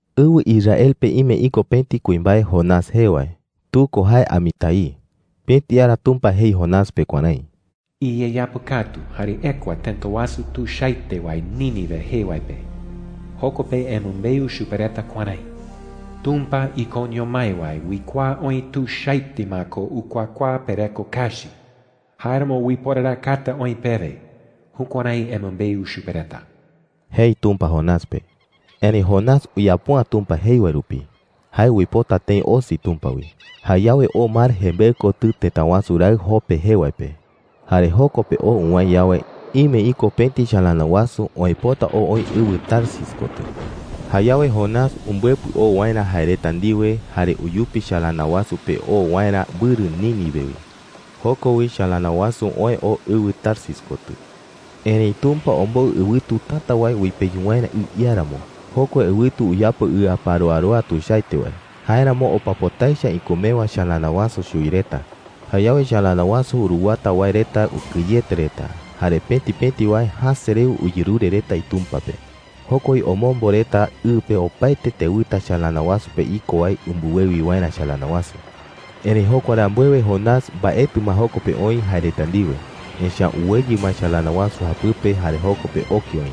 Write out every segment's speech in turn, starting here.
Ɨwɨ Israel pe ime iko pëti kuimbae Jonás jee wae. Tu ko jee Amitai. Pëti ara Tumpa jei Jonás pe kuärái: “Iyeyapɨkatu jare ekua tëta wasu tuichaete wae Nínive jee wae pe. Joko pe emɨmbeu chupe reta kuärái: ‘Tumpa ikoño mái wae uikuaa oï tuichaete ma ko ukuakuaa pereko kachi; jáeramo uiporarakata oï pewe.’ Jukuärái emɨmbeu chupe reta,” jei Tumpa Jonás pe. Erëi Jonás uyapo’ä Tumpa jei wae rupi. Jae uipota tëi osi Tumpa wi. Jayawe oo mar jembeɨ kotɨ tëta wasu raɨ Jope jee wae pe. Jare joko pe oo uwäe yawe, ime iko pëti chalana wasu oë pota oo oï ɨwɨ Tarsis kotɨ. Jayawe Jonás umbɨepɨ oo waerä jae reta ndiwe, jare uyupi chalana wasu pe oo waerä mbɨrɨ Nínive wi. Joko wi chalana wasu oë oo ɨwɨ Tarsis kotɨ. Erëi Tumpa ombou ɨwɨtu täta wae uipeyu waerä ɨ iáramo. Jokua ɨwɨtu uyapo ɨaparoaroa tuichaete wae. Jáeramo opa pota echa ikumewa chalana wasu chuwi reta. Jayawe chalana wasu uruwata wae reta ukɨyete reta, jare pëti pëti wae jäse rewe uyerure reta itumpa pe. Joko wi omombo reta ɨ pe opaete tewɨta chalana wasu pe iko wae umbɨwewi waerä chalana wasu. Erëi jokua rambuewe Jonás mbaetɨ ma joko pe oï jae reta ndiwe, echa’ä uweyɨ ma chalana wasu japɨpe jare joko pe oke oï.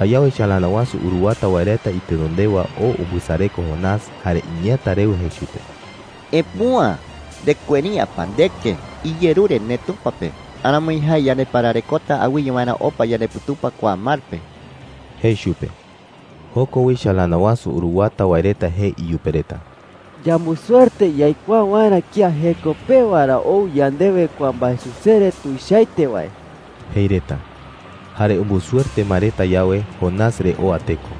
Jayawe chalana wasu uruwata wae reta itenondewa oo umbɨsareko Jonás, jare iñeeäta rewe jei chupe: “¡Epüa! ¿Ndekueri’ä pa ndeke? Iyerure ndeTumpa pe. Aramoi jae yandepararekota awɨye waerä opa yandeputupa kua mar pe,” jei chupe. Joko wi chalana wasu uruwata wae reta jei iyupe reta: “Yambusuerte yaikuaa waerä kía jeko pewa ra ou yandewe kua mbaesusere tuichaete wae,” jei reta. Jare umbusuerte ma reta yawe, Jonás re oa teko.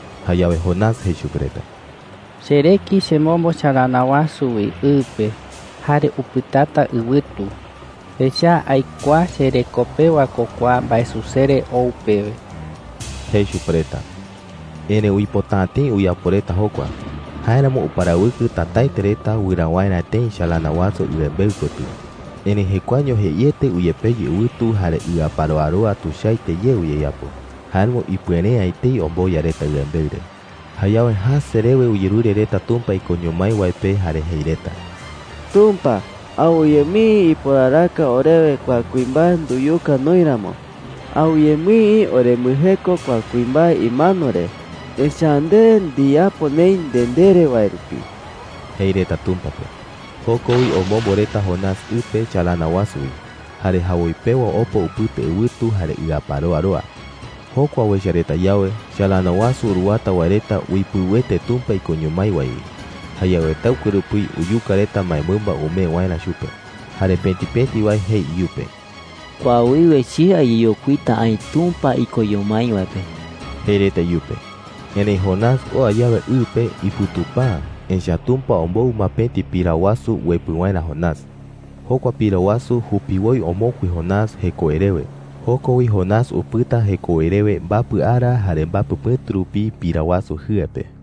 Jayawe Jonás jei chupe reta: “Chereki chemombo chalana wasu wi ɨ pe, jare upɨtata ɨwɨtu. Echa’ä aikuaa chereko pewa ko kua mbaesusere ou pewe,” jei chupe reta. Erëi uipota’ä tëi uyapo reta jokua. Jáeramo uparawɨkɨ tätaete reta wɨraa waerä tëi chalana wasu ɨembeɨ kotɨ. Erëi jekuaeño jeiete uyepeyu ɨwɨtu, jare ɨaparoaroa tuichaete ye uyeyapo. Jáeramo ipuere’ä etei omboya reta ɨembeɨ re. Jayawe jäse rewe uyerure reta Tumpa ikoño mái wae pe jare jei reta: “Tumpa, awɨye mii iporaraka orewe kua kuimbae nduyuka noï ramo. Awɨye mii orembɨjeko kua kuimbae imano re, echa’ä nde ndiyapo neï nde ndere wae rupi,” jei reta Tumpa pe. Joko wi omombo reta Jonás ɨ pe chalana wasu wi. Jare jawoi pewa opa upɨta ɨwɨtu jare ɨaparoaroa. Jokua uecha reta yawe, chalana wasu uruwata wae reta uipɨuete Tumpa ikoño mái wae wi. Jayawe taɨkue rupi uyuka reta mbaemɨmba umee waerä chupe. Jare pëti pëti wae jei iyupe: “Kua wiwe che ayeyokuita aï Tumpa ikoño mái wae pe,” jei reta iyupe. Erëi Jonás oa yawe ɨ pe, iputupa’ä, echa’ä Tumpa ombou ma pëti pira wasu uepɨ waerä Jonás. Jokua pira wasu jupiwoi omokui Jonás jekowe rewe. Joko wi Jonás upɨta jekowe rewe mbapɨ ara jare mbapɨ pɨ̈tu rupi pira wasu jɨe pe.